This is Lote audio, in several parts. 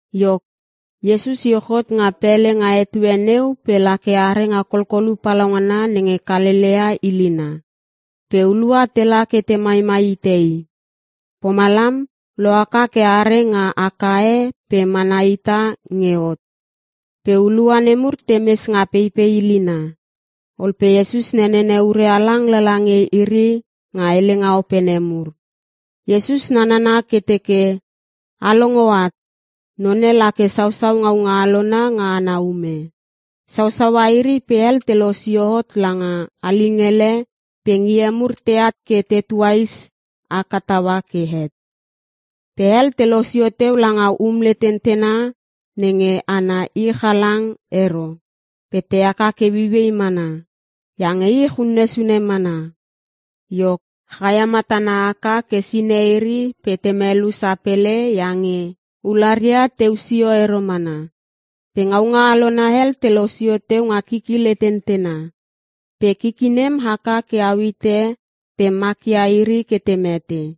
Iok, Iesus iuch hot nga pele nga etue neu pe la ke are nga kolkolu palaungana nenge Kalelea ilina. Pe hulua tela ke te maimai ite i. Pomalam, lo haka ke are nga aka e pe mana hita nge hot. Pe hulua nemur te mes nga peipei ilina. Ol pe Iesus nenene ure halang lala nge iri nga helenga opene mur. Iesus nanana ke teke, “A longo at, none lake sausaua ngaunga alona nga ana ume. Sausaua iri pe hel te losio hot langa alingele pe ngie mur teat ke te tuais haka taua ke het. Pe hel te losio teu langa um letentena nenge ana ich halang ero pe te haka ke ueiuei mana iange ich unne sune mana. Iok, chaia matana haka ke sine iri pe te melu sapele iange ularia teu sio ero mana. Pe ngaunga alona hel te losio teu nga kiki letentena. Pe kiki nem haka ke au hite pe makia iri ke te mete.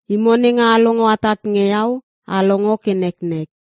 Imo nenge a longo atat nge Iau, a longo ke neknek.”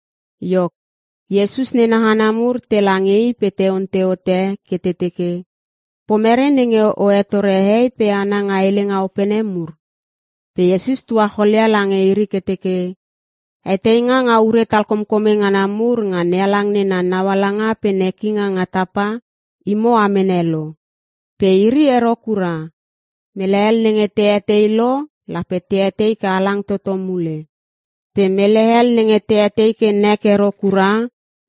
Iok, Iesus nena hana mur tela nge i pe te ontei hote ke te teke, “Pomere nenge o hetore hehei pe hana nga helenga opene mur?” Pe Iesus tuacholia lange iri ke teke, “Heteinga nga ure talkomkome ngana mur nga NeHalang nena naualanga pe nekinga nga tapa, imo a mene lo. Pe iri ero kura. Mele hel nenge te etei lo lape te etei ke halang toto mule. Pe mele hel nenge te etei ke nek ero kura,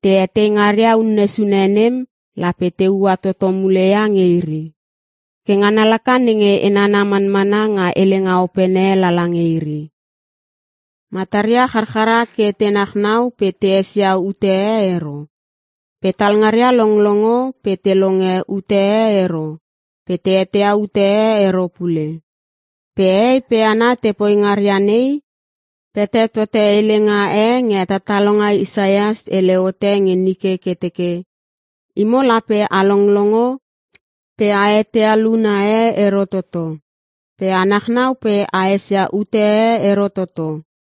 te etei ngaria unne sune nem lape te ua toto mule ia nge iri. Ke ngana laka nenge e nana manmana nga helenga opene lala nge iri: “Mataria charchara ke te nachnau pe te esia ute e ero. Pe talngaria longlongo pe te longe ute e ero pe te eteia ute e ero pule.” Pe hehei pe hana te poi ngaria nei, pete tote helenga e nge hetatalonga Isaias hele hote nge nike ke teke, “‘Imo lape a longlongo pe a eteia luna e ero toto. Pe a nachnau pe a esia ute e ero toto.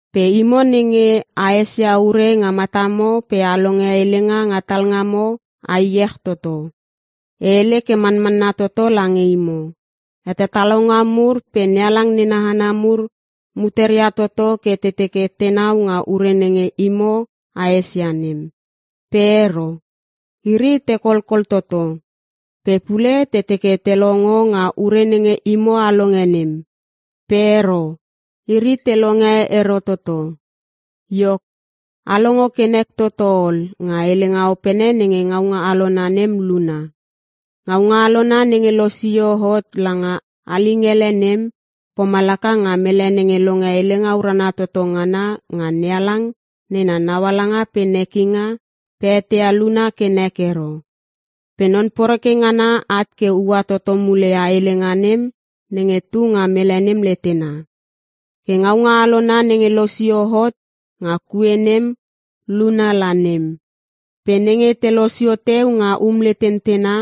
Pe imo nenge a esia ure nga matamo pe a longe helenga nga talngamo a iech toto. E hele ke manmanna toto lange imo, hetatalonga mur pe NeHalang nena hana mur muteria toto ke te teke tenau nga ure nenge imo a esia nem. Pe ero, iri te kolkol toto. Pe pule te teke te longo nga ure nenge imo a longe nem. Pe ero, iri te longe ero toto. “Iok, a longo ke nek toto ol nga helenga opene nenge ngaunga alona nem luna. Ngaunga alona nenge losio hot langa alingele nem, pomalaka nga mele nenge longe Helenga Urana Toto Ngana nga NeHalang nena naualanga pe nekinga pe eteia luna ke nek ero. Pe non poreke ngana at ke ua toto mule ia helenga nem nenge tu nga mele nem letena. Ke ngaunga alona nenge losio hot nga kue nem luna la nem. Pe nenge te losio teu nga um letentena,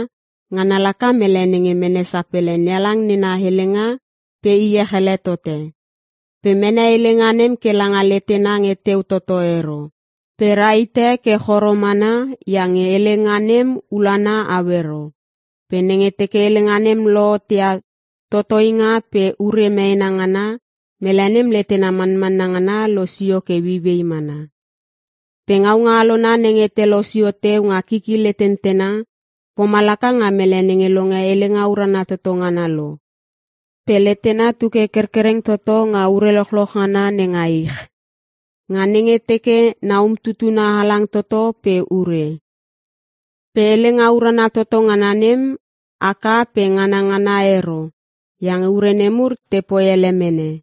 ngana laka mele nenge mene sapele NeHalang nena helenga pe iech ele tote. Pe mene helenga nem ke langa letena nge teu toto ero. Pe ra hite ke choro mana iange helenga nem ulana au ero. Pe nenge teke helenga nem lohot ia totoinga pe ure meena ngana, mele nem letena manmanna ngana losio ke ueiuei mana. Pe ngaunga alona nenge te losio teu nga kiki letentena, pomalaka nga mele nenge longe Helenga Urana Toto Ngana lo, pe letena tu ke kerkereng toto nga ure lochloch ngana nenga ich. Nga nenge teke na umtutuna halang toto pe ure. Pe Helenga Urana Toto Ngana nem, haka pe nganangana ero iange ure nemur te poi hele mene.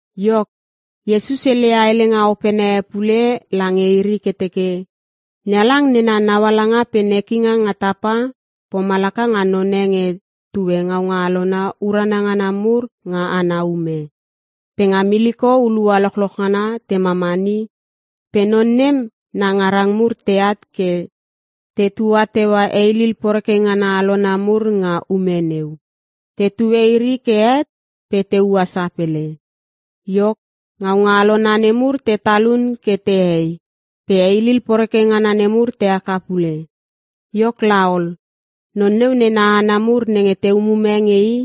Iok, Iesus heleia helenga opene e pule lange iri ke teke, “NeHalang nena naualanga pe nekinga nga tapa, pomalaka nga none nge tue ngaunga alona urana ngana mur nga ana ume. Pe nga miliko hulua lochloch ngana te mamani, pe non nem na ngarang mur teat ke te tua teua heilil poreke ngana alona mur nga ume neu. Te tue iri ke het pe te ua sapele. Iok, ngaunga alona nemur te talun ke te hei pe heilil poreke ngana nemur te haka pule. “Iok laol, non neu nena hana mur nenge te umume nge i,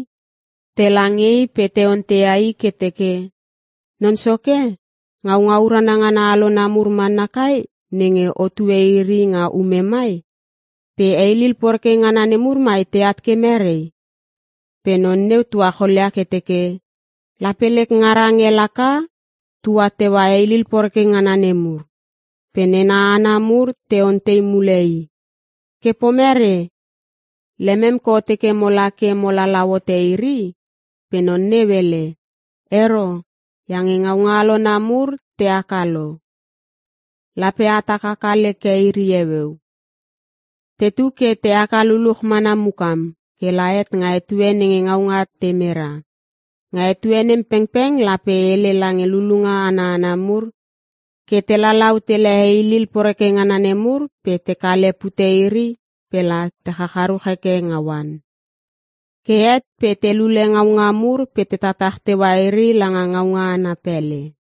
tela nge i pe te onteia i ke teke, ‘Non soke, ngaunga urana ngana alona mur mana kai nenge otue iri nga ume mai? Pe heilil poreke ngana nemur mai teat ke merei?’ “Pe non neu tuacholia ke teke, ‘Lape lek ngarang e laka tua teua heilil poreke ngana nemur.’ “Pe nena hana mur te ontei mule i, ‘Ke pomere? Lemem ke o teke mo la ke mo lalau hote iri?’ “Pe non neu hele, ‘Ero, iange ngaunga alona mur te haka lo. Lape a tak haka leke iri heueu. Tetu ke te haka luluch mana mukam, ke la het nga etue nenge ngaunga te mera. Nga etue nem pengpeng lape e hele lange lulunga ana hana mur ke te lalau tele heilil poreke ngana nemur pe te kale pute iri pe la te chacharuch heke nga oan. Ke het pe te lule ngaunga mur pe te tatach teua iri langa ngaunga ana pele.’”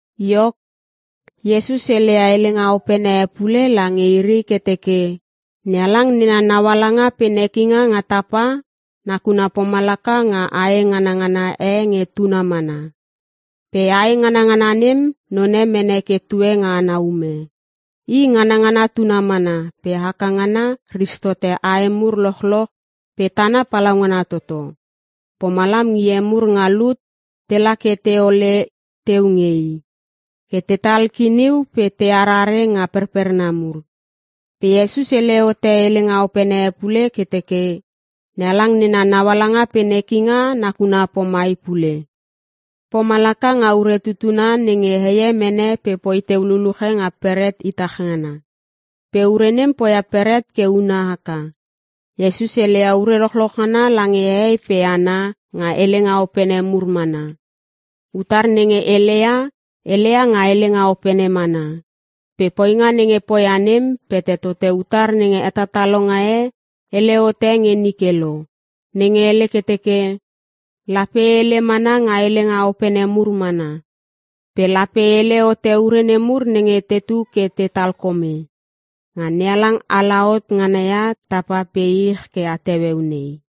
Iok, Iesus heleia helenga opene e pule lange iri ke teke, “NeHalang nena naualanga pe nekinga nga tapa, nakuna pomalaka nga ae nganngana e nge tuna mana. Pe ae nganngana nem, none mene ke tue nga ana ume. I nganangana tuna mana pe haka ngana, ris tote ae mur lochloch pe tana palaungana toto. Pomalam ngie mur nga lut tela ke te ole teu nge i, ke tetal kiniu pe te arare nga perperna mur.” Pe Iesus hele hote helenga opene e pule ke teke, “NeHalang nena naualanga pe nekinga nakuna pomai pule. Pomalaka nga ure tutuna nenge heie mene pe poi teu luluche nga beret itach ngana. Pe ure nem poia beret ke una haka.” Iesus heleia ure lochloch ngana lange hehei pe hana nga helenga opene mur mana. Utar nenge heleia, heleia nga helenga opene mana. Pe poinga nenge poia nem, pete tote utar nenge hetatalonga e hele hote nge nike lo, nenge hele ke teke, “Lape e hele mana nga helenga opene mur mana. Pe lape e hele hote ure nemur nenge tetu ke te talkome, nga NeHalang ala hot ngana ia tapa pe ich ke at heueu nei.”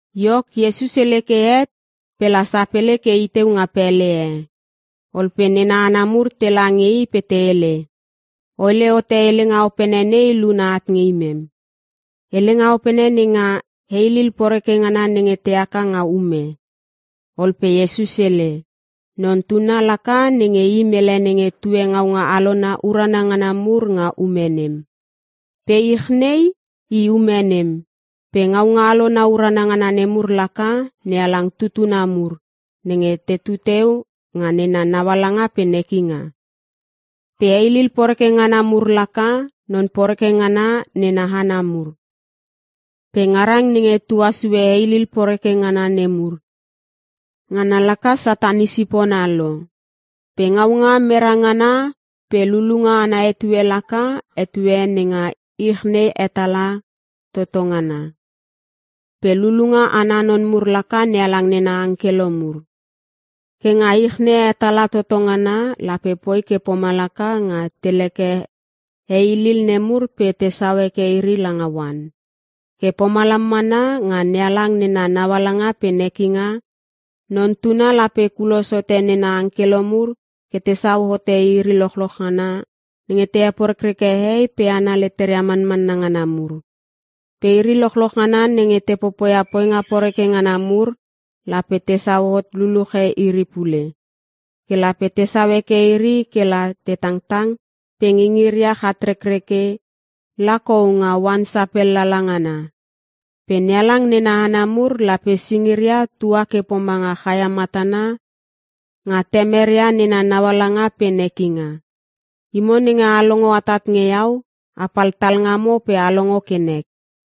Iok, Iesus hele ke het pe la sapele ke i teu nga pele e. Ol pe nena hana mur tela nge i pe te hele, “O hele hote helenga opene nei luna at nge imem. Helenga opene nenga heilil poreke ngana nenge te haka nga ume.” Ol pe Iesus hele, “Non Tuna laka nenge I mele nenge tue ngaunga alona urana ngana mur nga ume nem. Pe ich nei, i ume nem. Pe ngaunga alona urana ngana nemur laka NeHalang tutuna mur, nenge tetu teu nga nena naualanga pe nekinga. Pe heilil poreke ngana mur laka, non poreke ngana nena hana mur. Pe ngarang nenge tua sue heilil poreke ngana nemur, ngana laka Satan i sipona lo. Pe ngaunga mera ngana pe lulunga ana etue laka, etue nenga ich nei hetala toto ngana. Pe lulunga ana non mur laka NeHalang nena angkelo mur. “Ke nga ich nei hetala toto ngana, lape poi ke pomalaka nga te leke heilil nemur pe tesau heke iri langa oan. Ke pomalam mana, nga NeHalang nena naualanga pe nekinga. Non Tuna lape kulos hote nena angkelo mur ke tesau hote iri lochloch ngana nenge te heporekreke hehei pe hana leteria manmanna ngana mur. Pe iri lochloch ngana nenge te popoia poinga poreke ngana mur, lape tesau hot luluche iri pule. Ke lape tesau heke iri ke la te tangtang pe ngingiria chatrekreke la kou nga oan sapel lala ngana. Pe NeHalang nena hana mur, lape singiria tua ke pomanga chaia matana nga Temeria nena naualanga pe nekinga. Imo nenge a longo atat nge Iau, a pal talngamo pe a longo ke nek!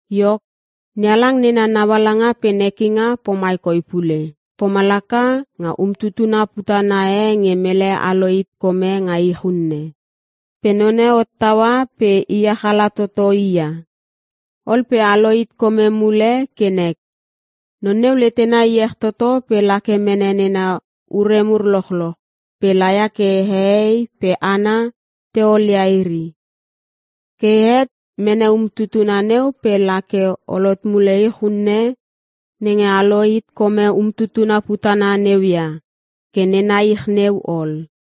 “Iok, NeHalang nena naualanga pe nekinga pomai koi pule. Pomalaka nga umtutuna putana e nge mele alo hit kome nga ich unne. Pe none hottaua pe iech ala toto i ia. Ol pe alo hit kome mule ke nek. Non neu letena iech toto pe la ke mene nena ure mur lochloch, pe la ia ke hehei pe hana te olia iri. Ke het, mene umtutuna neu, pe la ke ol hot mule ich unne nenge alo hit kome umtutuna putana neu ia, ke nena ich neu ol.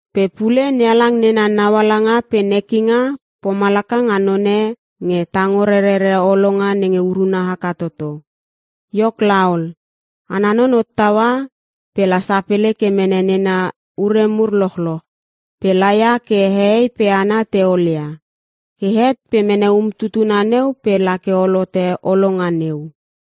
“Pe pule NeHalang nena naualanga pe nekinga pomalaka nga none nge tango rerere holonga nenge uruna haka toto. Iok laol, ana non hottaua pe la sapele ke mene nena ure mur lochloch, pe la ia ke hehei pe hana te olia. Ke het pe mene umtutuna neu pe la ke ol hote holonga neu.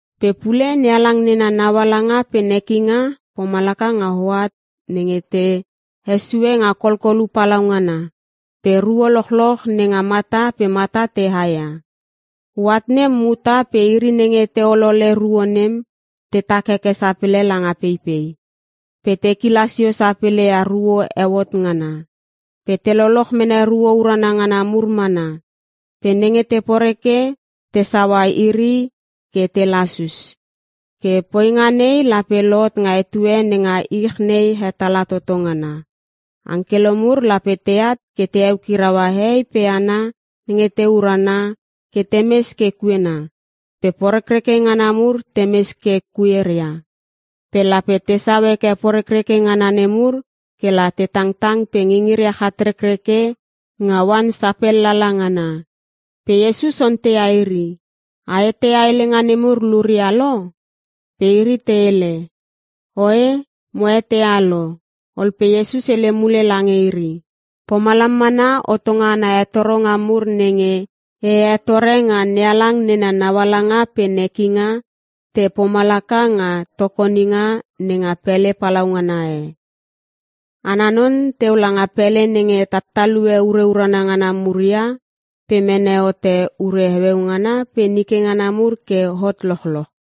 “Pe pule NeHalang nena naualanga pe nekinga pomalaka nga hoat nenge te hesue nga kolkolu palaungana pe ruo lochloch nenga mata pe mata te haia. Hoat nem muta pe iri nenge te olole ruo nem, tetak heke sapele langa peipei, pe te kila sio sapele ia ruo eu hot ngana. Pe te loloch mene ruo urana ngana mur mana. Pe nenge te poreke tesaua iri ke te lasus. Ke poinga nei lape lohot nga etue nenga ich nei hetala toto ngana. Angkelo mur lape teat ke te eukiraua hehei pe hana nenge te urana ke te mes ke kuena, pe porekreke ngana mur te mes ke kueria. Pe lape tesau heke porekreke ngana nemur ke la te tangtang pe ngingiria chatrekreke nga oan sapel lala ngana.” Pe Iesus onteia iri, “A eteia helenga nemur luria lo?” Pe iri te hele, “Oe mo eteia lo.” Ol pe Iesus hele mule lange iri, “Pomalam mana hotonga ana hetoronga mur nenge e hetore nga NeHalang nena naualanga pe nekinga, te pomalaka nga tokoninga nenga pele palaungana e. Ana non teu langa pele nenge tattalue ure urana ngana mur ia, pe mene hote ure heueu ngana pe nike ngana mur ke hot lochloch.”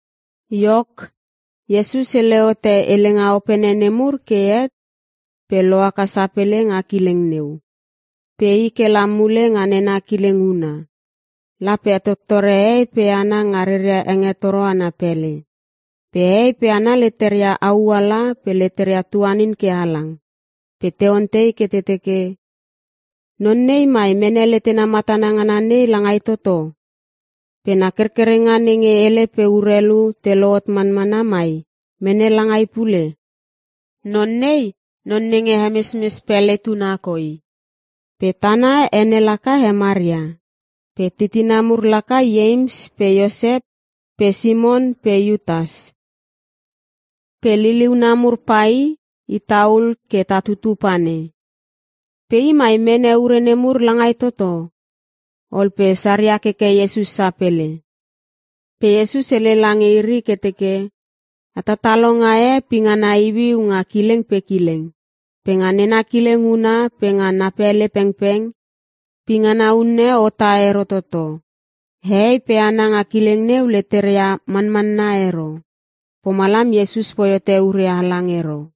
Iok, Iesus hele hote helenga opene nemur ke het pe lo haka sapele nga kileng neu. Pe i ke la mule nga nena kileng huna. La pe hetottore hehei pe hana nga reria hengetoro ana pele. Pe hehei pe hana leteria au ala pe leteria tuanin ke halang. Pe te ontei ke te teke, “Non nei mai mene letena matana ngana nei langai toto? Pe na kerkerenga nenge hele pe urelu te lohot manmana mai mene langai pule? Non nei, non nenge hemesmes pele tuna koi. Pe tana ene laka he Maria. Pe titina mur laka Ieims pe Iosep pe Simon pe Iutas. Pe liliuna mur pai, ita ul ke ta tutu panei. Pe I mai mene ure nemur langai toto?” Ol pe saria keke Iesus sapele. Pe Iesus hele lange iri ke teke, “Hetatalonga e pingana iuiu nga kileng pe kileng. Pe nga nena kileng huna pe nga na pele pengpeng, pingana unne hota ero toto.” Hehei pe hana nga kileng neu leteria manmanna ero. Pomalam Iesus poi hote ure halang ero.